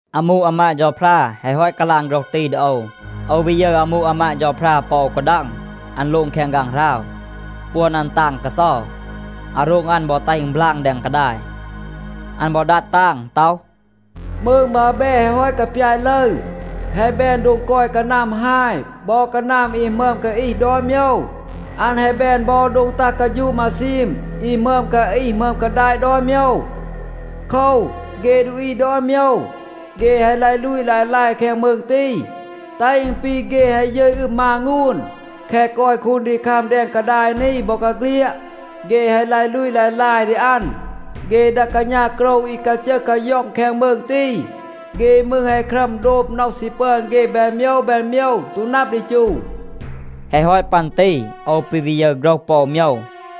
อามู อามาด เฌาพรา แฮะ ฮอต กาลาง โฆรห ตี ดี โอว, โอว วี ยึร อามู อามาด เฌาพรา ปอ อู กาดัง. อัน โลง แคง ฆางหราว. ปวน อัน ตาง กาเซา, อาโรง อัน บอ แตห อึณ บลาง แดง กาดาย. อัน บอ ดัด ตาง ต็อห, “มืง บาแบ แฮะ ฮอต กาปยาต ลึร, แฮะ แบน โดง กอย กานัม ฮาย บอ กานัม อี หมึอม กาอีห ดอน โมยว. อัน แฮะ แบน บอ โดง ตัห กาฌูะ มาซีม อี หมึอม กาอีห หมึอม กาดาต ดอน โมยว. โคว, เฆ ดูอี ดอน โมยว, เฆ แฮะ ลาย ลูต ลาย ลาย แคง มืง ตี, แตห อึณ ปี เฆ แฮะ ยึต อึม มางูน. แคะ กอย คูนดีคัม แดง กาดาย นี บอกาเฆลียด, เฆ แฮะ ลาย ลูต ลาย ลาย ดี อัน. เฆ ดา กาณา โกรว อี กาจึห กาย็อง แคง มืง ตี, เฆ มืร แฮะ ครัม โดบ น็อห ซี ปึอน เฆ แบน โมยว แบน โมยว ตู นับ ดี จู.” แฮะ ฮอต ปัน ตี โอว ปี วี ยึร โฆรห ปอ อู โมยว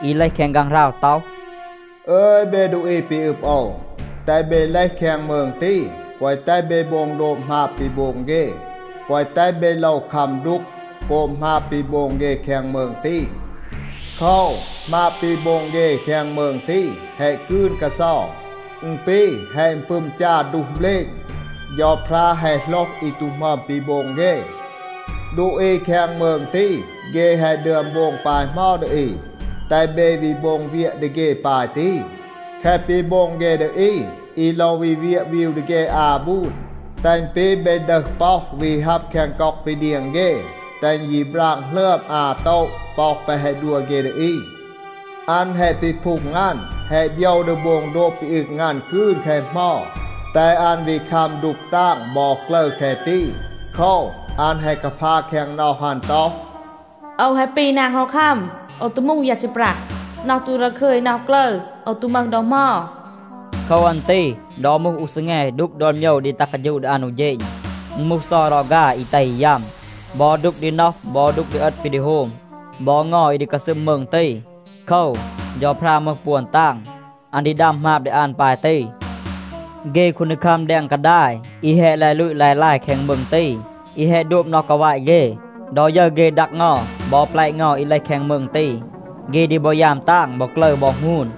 อี เลห แคง ฆางหราว ต็อห, “อึย เบ ดูอี ปี อึบ โอว, แตห เบ เลห แคง มืง ตี, แกวะ แตห เบ โบง โดบ หมาบ ปี โบง เฆ, แกวะ แตห เบ โลว คัม ดูก โกบ หมาบ ปี โบง เฆ แคง มืง ตี. โคว, หมาบ ปี โบง เฆ แคง มืง ตี แฮะ กืน กาเซา. อึณ ปี แฮะ อึณปึม จา ดูห เบลณ. เฌาพรา แฮะ โหลห อี ตู หมึอม ปี โบง เฆ. ดูอี แคง มืง ตี, เฆ แฮะ ดึอม โบง ปาย เหมา ดี อี, แตห เบ วี โบง เวียะ ดี เฆ ปาย ตี. แคะ ปี โบง เฆ ดี อี, อี โลว วี เวียะ วีว ดี เฆ อา บูน, แตห อึณ ปี เบ ดึห ป็อห วี ฮับ แคง ก็อก ปี เดียง เฆ. แตห อึณ ยี ปราง หลึอม อา บูน ป็อห แปะ แฮะ ดัว เฆ ดี อี. อัน แฮะ ปีพูง อัน, แฮะ โบยว ดี โบง โดบ ปี อึง อัน กืน แคะ เหมา, แตห อัน วี คัม ดูก ตาง บอ กลึร แคะ ตี. โคว, อัน แฮะ กาพา แคง น็อห อัน ต็อห, ‘โอว แฮะ ปี นาง ฮอคัม. โอว ตู มูห ยา ซีปรัห. น็อห ตู ดาคึย น็อห กลึร, โอว ตู มึห ดอ เหมา.’ โคว อัน ตี ดอ มูห อู ซีแง ดูก ดอน โมยว ดี ตัห กาฌูะ ดี อัน อู เฌณ. อึณ มูห เซา รอฆา อี แตห อี ยัม, บอ ดูก ดี น็อห บอ ดูก ดี เอต ปี ดี โฮม บอ เงา อี ดี กาซึม มืง ตี. โคว, เฌาพรา มึห ปวน ตาง. อัน ดี ดัม หมาบ ดี อัน ปาย ตี.” เฆ คูนดีคัม แดง กาดาย อี แฮะ ลาย ลูต ลาย ลาย แคง มืง ตี, อี แฮะ โดบ น็อห กาวาต เฆ, ดอ ยึร เฆ ดัก เงา บอ แปละ เงา อี เลห แคง มืง ตี, เฆ ดี บอ ยาม ตาง บอ กลึร บอ หงูน.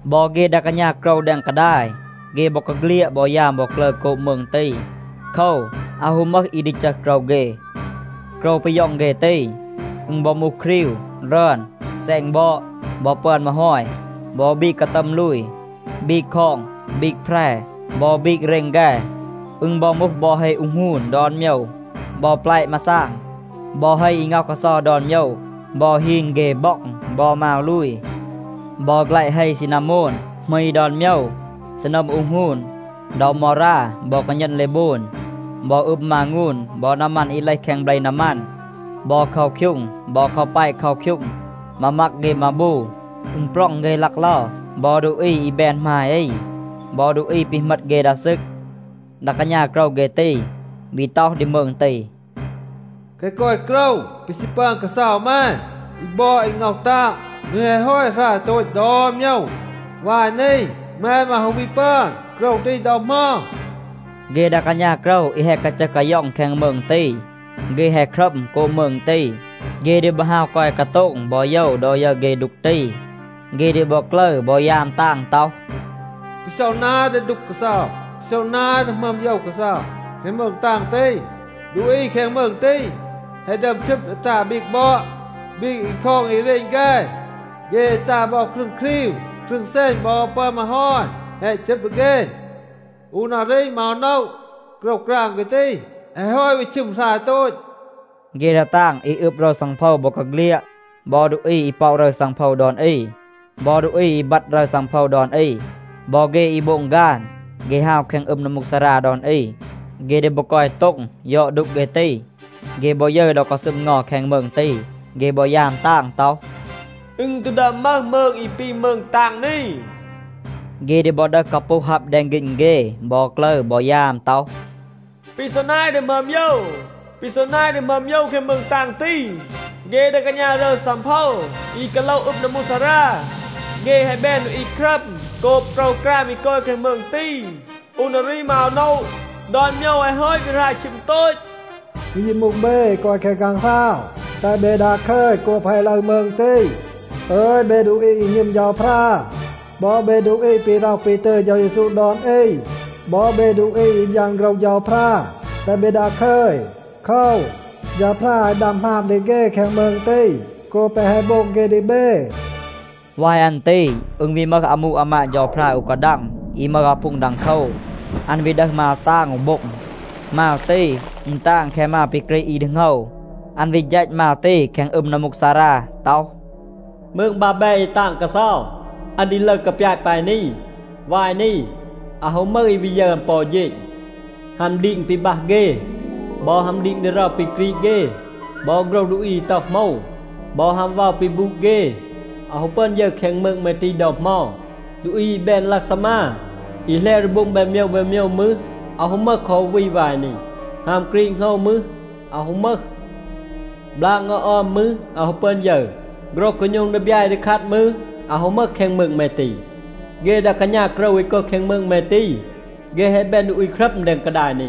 บอ เฆ ดา กาณา โกรว แดง กาดาย, เฆ บอกาเฆลียด บอ ยาม บอ กลึร โกบ มืง ตี. โคว, อาว ฮู มึห อี ดี จึห โกรว เฆ. โกรว ปี ย็อง เฆ ตี, อึณ บอ มูห ครีว, รึอน, แซณ บอด, บอ ปึอน มาฮอย, บอ บีก กาตัม ลูย, บีก คอง, บีก แพร, บอ บีก เรณ แฆ. อึณ บอ มูห บอ เฮ อูห หงูน ดอน โมยว, บอ แปละ มาซาง, บอ เฮ อี ง็อห กาเซา ดอน โมยว, บอ ฮีน, เฆ บ็อง บอ มาว ลูย. บอ แฆละ เฮ ซีนาโมน, หมี ดอน โมยว, ซีนัม อูห หงูน, เดา มอรา บอ กาณัน เลโบน, บอ อึม มางูน บอ นามัน อี เลห แคง เบล นามัน, บอ เคาคยูง บอ กาแปะ เคาคยูง, มามัก เฆ มาบู, อึณปร็อง เฆ ลักเลา, บอ ดูอี อี แบน หมาย อี บอ ดูอี ปี เหมต เฆ ดา ซึก. ดา กาณา โกรว เฆ ตี, วี ต็อห ดี มืง ตี, “แคะ กอย โกรว ปี ซี ปึอน กาเซา แม, อี บอด อี ง็อห ตาง, อึณ แฮะ ฮอต หราย โตต ดอน โมยว. วาย นี, แม มืร อาว ฮู วี ปึอน โกรว ตี ดอ เหมา.” เฆ ดา กาณา โกรว อี แฮะ กาจึห กาย็อง แคง มืง ตี, เฆ แฮะ ครัม โกบ มืง ตี, เฆ ดี บอ ฮาว กอย กาโต็ง บอ โยว ดอ ยึร เฆ ดูก ตี. เฆ ดี บอ กลึร บอ ยาม ตาง ต็อห, “ปี ซอ นาย ดี ดูก กาเซา. ปี ซอ นาย ดี หมึอม โยว กาเซา แคง มืง ตาง ตี. ดูอี แคง มืง ตี แฮะ ดึอม ชึบ ดี ตา บีก บอด, บีก อี คอง อี เรณ แฆ. เฆ แฮะ ตา บอ ครึง ครีว. ครึง แซณ บอ ปึอน มาฮอย แฮะ ชึบ ดี เฆ. อู นารี มืร อาว โนะ, โกรวกราม เฆ ตี แฮะ ฮอต วี ชึม หราย โตต.” เฆ ดา ตาง อี อึบ รึร ซังโพว บอกาเฆลียด บอ ดูอี อี ป็อะ รึร ซังโพว ดอน อี, บอ ดูอี อี บัด รึร ซังโพว ดอน อี, บอ เฆ อี โบง ฆาน, เฆ ฮาว แคง อึม นัมมูกซารา ดอน อี, เฆ ดี บอ กอย โต็ง, ยอด ดูก เฆ ตี. เฆ บอ ยึร ดอ กาซึม เงา แคง มืง ตี, เฆ บอ ยาม ตาง ต็อห, “อึณ ตู ดึอม มึห มืง อี ปี มืง ตาง นี.” เฆ ดี บอ ดึห กาปูห ฮับ แดง ฆีณ เฆ บอ กลึร บอ ยาม ต็อห, “ปี ซอ นาย ดี หมึอม โยว, ปี ซอ นาย ดี หมึอม โยว แคง มืง ตาง ตี. เฆ ดา กาณา รึร ซังโพว อี กาโลห อึม นัมมูกซารา, เฆ แฮะ แบน ดูอี ครัม โกบ โกรวกราม อี กอย แคง มืง ตี. อู นารี มืร อาว โนะ, ดอน โมยว แฮะ ฮอต วี หราย ชึม โตต. อึณ ยี มูห เบ อี กอย แคง ฆางหราว, แตห เบ ดาคึย โกบ แฮะ ลึร มืง ตี. อึย เบ ดูอี อี หณึม เฌาพรา บอ เบ ดูอี ปี ร็อห ปี ตึย เฌา เยซู ดอน อี, บอ เบ ดูอี อี บยาน โฆรห เฌาพรา, แตห เบ ดาคึย. โคว, เฌาพรา แฮะ ดัม หมาบ ดี เฆ แคง มืง ตี โกบ แปะ แฮะ โบง เฆ ดี เบ.” วาย อัน ตี อึณ วี มึห อามู อามาด เฌาพรา อู กาดัง อี มึห อาพูง ดังโคว, อัน วี ดึห มาว ตาง อู โบ็ง. มาว ตี, อึณ ตาง แคะ มาว ปี กรีด อี ดี โหงว. อัน วี ฌัต มาว ตี แคง อึม นัมมูกซารา ต็อห, “มืง บาแบ อี ตาง กาเซา, อัน ดี ลึร กาปยาต ปาย นี. วาย นี, อาว ฮู มึห อี วี ยึร อัน ปอ อู เฌณ. ฮัม ดีง ปี บัห เฆ บอ ฮัม ดีง ดีเรา ปี กรีด เฆ บอ โฆรห ดูอี, อี ต็อห โหมว บอ ฮัม เวา ปี บูด เฆ, อาว ฮู ปึอน ยึร แคง มืง แม ตี ดอ เหมา. ดูอี อี แบน ลักซามา อี แหลว ดี โบง แบน โมยว แบน โมยว มืร, อาว ฮู มึห คอ อู วี วาย นี. ฮัม กรีด โหงว มืร, อาว ฮู มึห. บลาง เงา ออม มืร, อาว ฮู ปึอน ยึร. โฆรห กาโณม ดีบยา อี ดี คัด มืร, อาว ฮู มึห แคง มืง แม ตี. เฆ ดา กาณา โกรว อี กอย แคง มืง แม ตี, เฆ แฮะ แบน ดูอี ครัม แดง กาดาย นี.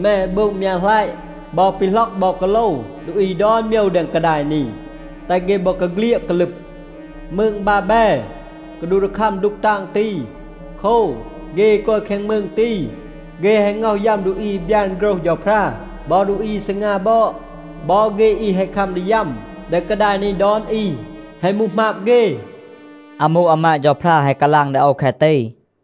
แม แฮะ โบง มยัะหลัยะ บอ ปีหล็อก บอ กาโลว ดูอี ดอน โมยว แดง กาดาย นี, แตห เฆ บอกาเฆลียด กาลึบ. มืง บาแบ กาดูห ดี คัม ดูก ตาง ตี. โคว, เฆ อี กอย แคง มืง ตี, เฆ แฮะ ง็อห ยัม ดูอี อี บยาน โฆรห เฌาพรา บอ ดูอี อี ซีงา บอด. บอ เฆ อี แฮะ คัม ดี ยัม แดง กาดาย นี ดอน อี, แฮะ มูห หมาบ เฆ.” อามู อามาด เฌาพรา แฮะ กาลาง ดี โอว แคะ ตี.